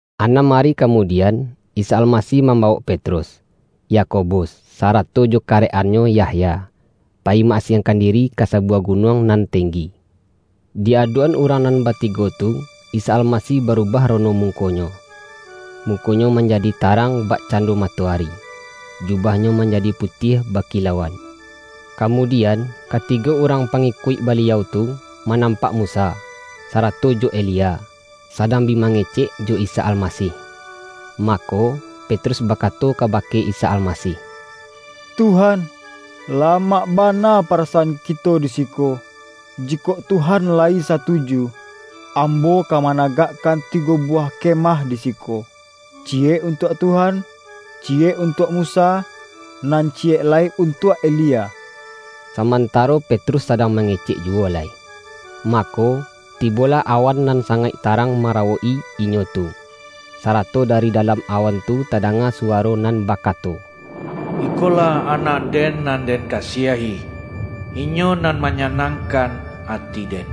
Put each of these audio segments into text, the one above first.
Anam ari kamudian, Isa Almasih mambawok Petrus, Yakobus sa-rato jo karek-annyo Yahya, payi ma-asiangkan diri ka sabuwah gunuang nan tenggi. Di adok-an urang nan batigo tu, Isa Almasih barubah rono muko-Nyo: Muko-Nyo manjadi tarang bakcando matoari, jubah-Nyo manjadi putiah bakilauan. Kamudian, katigo urang pangikuik Baliau tu, manampak Musa, sarato jo Elia, sadang bi mange-cek jo Isa Almasih. Mako, Petrus ba-kato kabake Isa Almasih,”Tuhan, la-mak bana parasaan kito di siko. Jikok Tuhan layi satuju, ambo ka managak-kan tigo buwah kemah di siko: ciyek untuak Tuhan, ciyek untuak Musa, nan ciyek lai untuak Elia.” Samantaro Petrus sadang mange-cek juwo lai, mako, tibolah awan nan sangaik tarang marawok-i inyo tu, sa-rato dari dalam awan tu tadanga su-waro nan bakato,”Ikolah Anak-Den, nan Den kasiahi. Inyo nan manyanang-kan ati-Den.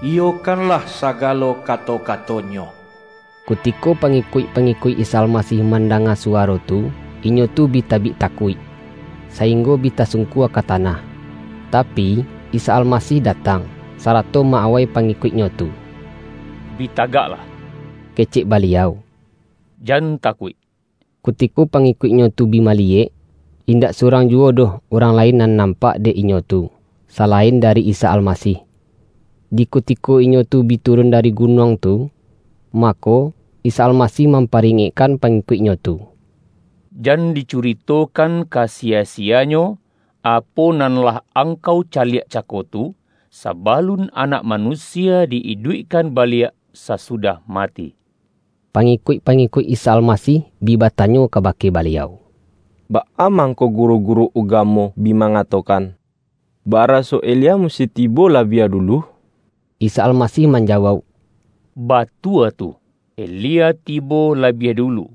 Iyokanlah sagalo kato-kato-Nyo!” Kutiko pangikuik-pangikuik Isa Almasih mandanga suwaro tu, inyo tu bi tabik takuik, sainggo bi tasung-kua ka tanah. Tapi, Isa Almasih da-tang, sarato ma-awai pangikuik-Nyo tu.”Bi tagaklah,” kecek Baliau,”jan takuik!” Kutiko pangikuik-Nyo tu bi maliyek, indak surang juwo doh urang lain nan nampak dek inyo tu, salain dari Isa Almasih. Di kutiko inyo tu bi turun dari gu-nuang tu, mako, Isa Almasih mam-paringekkan pangikuik-Nyo tu,”Jan dicuritokan ka siya-siyanyo, apo nan lah angkau caliak cako tu, sabalun Anak Manusia di iduikkan baliak sa-sudah mati.” Pangikuik-pangikuik Isa Almasih bi batanyo kabake Baliau,”Baa mang-ko guru-guru ugamo bi mangatokan, baraso Elia musti tibo labiah dulu?” Isa Almasih manjawauk,”Batua tu, Elia tibo labiah dulu,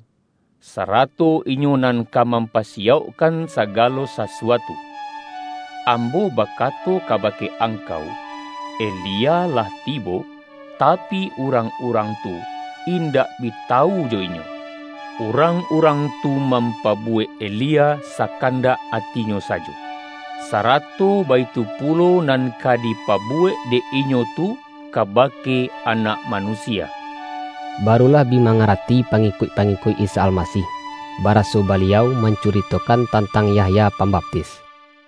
sarato inyo nan ka mampasiyaukkan sagalo sasuatu. Ambo bakato kabake angkau, Elia lah tibo, tapi, urang-urang tu indak bi tawu jo inyo; urang-urang tu mampa-buwek Elia sakandak atinyo sajo. Sa-rato baitu pulo nan ka dipabuwek dek inyo tu kabake Anak Manusia.” Barulah bi mangarati pangikuik-pangikuik Isa Almasih, baraso Baliau mancuritokan tantang Yahya Pam-baptis.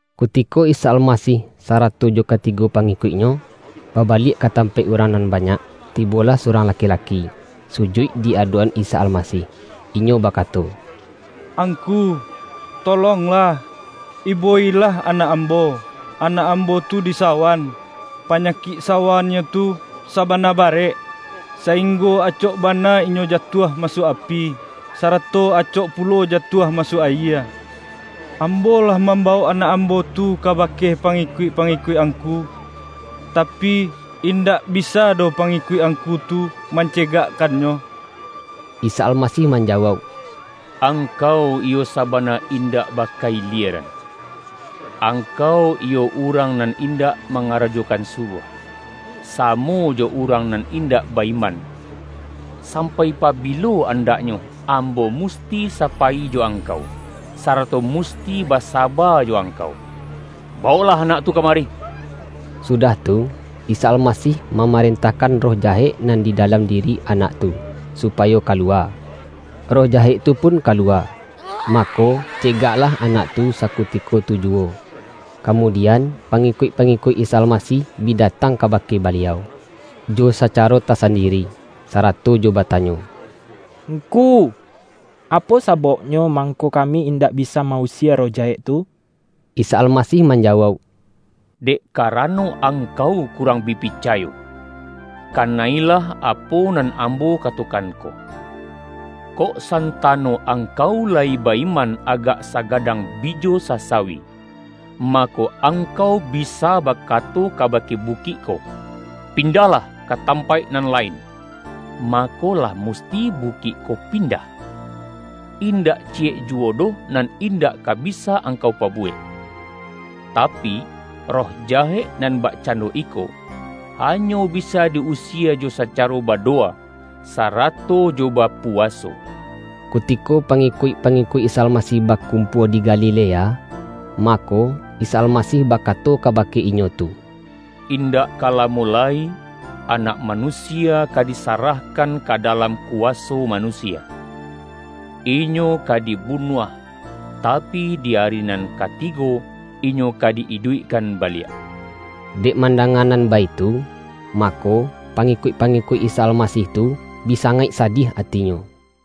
Kutiko Isa Almasih sarato jo ka-tigo pangikuik-Nyo, babaliak ka tam-paik urang nan banyak, tibolah surang laki-laki, sujuik di adok-an Isa Almasih, inyo bakato,”Angku, tolonglah, ibo-ilah anak ambo. Anak ambo tu disawan. Panyakik sawannyo tu sa-bana barek, sainggo acok bana inyo jatuah masuak api, sarato acok pu-lo jatuah masuak ayie. Ambo lah mambawok anak ambo tu kabake pa-ngikuik-pangikuik Angku, tapi, indak bisa doh pangikuik Angku tu mance-gakkannyo.” Isa Almasih manjawauk,”Angkau iyo sabana indak baka-ilieran! Angkau iyo urang nan indak mangarajokan suruah, samo jo urang nan indak ba-iman. Sampai pabilo andaknyo Ambo musti sapayi jo angkau, sarato mus-ti basaba jo angkau? Bawoklah anak tu kamari!” Sudah tu, Isa Almasih mamarentahkan roh jahek nan di da-lam diri anak tu, supayo kaluwa. Roh jahek tu pun kaluwa, mako, cegaklah anak tu sakutiko tu juwo. Kamudian, pangikuik-pangikuik Isa Almasih bi datang kabake Baliau, jo sacaro tasandiri, sarato jo bata-nyo,”Ngku, apo sabauknyo mangko kami indak bisa ma-usie roh jahek tu?” Isa Almasih manjawauk,”Dek ka-rano angkau kurang bi picayo. Kana-ilah apo nan Ambo katokan ko! Kok santano angkau layi ba-iman agak sa-gadang bijo sasawi, mako, angkau bi-sa bakato kabake bukik ko, ’Pindahlah ka tampaik nan lain!’ mako, lah mus-ti bukik ko pindah. Indak ciyek juwo doh nan indak ka bisa angkau pabu-wek! [ Tapi, roh jahek nan bakcando iko, hanyo bisa di-usie jo sacaro ba-dowa, sarato jo bapuwaso.]" Kutiko pangikuik-pangikuik Isa Almasih bakumpua di Galilea, ma-ko, Isa Almasih bakato kabake inyo tu,”Indak ka lamo lai, Anak Manu-sia ka disarahkan ka dalam kuwaso manusia. Inyo ka dibunuah, tapi, di ari nan katigo Inyo ka di-iduikkan baliak.” Dek mandanga nan baitu, mako, pa-ngikuik-pangikuik Isa Almasih tu, bi sangaik sadiah atinyo.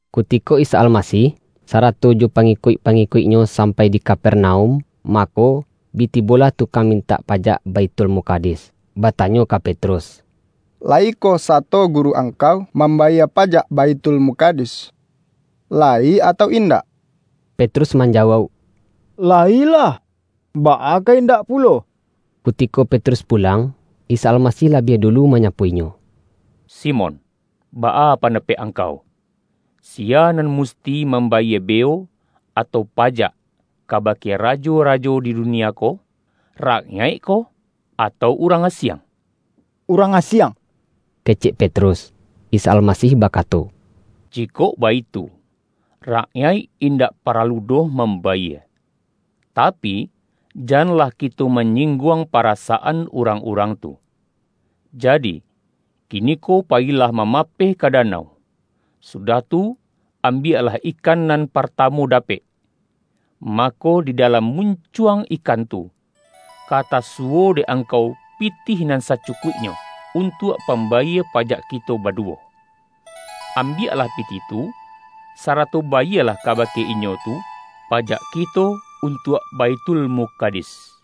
Kutiko Isa Almasih sarato jo pa-ngikuik-pangikuik-Nyo sampai di Ka-pernaum, mako, bi tibolah tukang min-tak pajak Baithulmukadis, batanyo ka Petrus,”Layikoh sato Guru angkau mambayie pajak Baithulmukadis, layi atau indak?” Petrus manjawauk,”Layilah, baa ka indak pulo!” Kutiko Petrus pulang, Isa Almasih labiah dulu manyapo inyo,”Simon, baa pandapek angkau? Siya nan musti mambayie beo, atau pajak, kabake ra-jo-rajo di dunia ko? Rakyaikkoh, atau urang asiang?” ”Urang asiang,” kecek Petrus. Isa Almasih bakato,”Jikok baitu, rak-yaik indak paralu doh mambayie. Tapi, janlah kito manyingguang parasaan urang-urang tu. Jadi, kiniko payilah mamapeh ka danau. Sudah tu, ambiak-lah ikan nan partamu dapek. Mako, di dalam muncuang ikan tu, ka tasuwo dek angkau pitih nan sacukuiknyo, untuak pambayie pajak kito baduwo. Ambiak-lah pitih tu, sarato bayielah kabake inyo tu, pajak kito untuak Baithulmukad is.”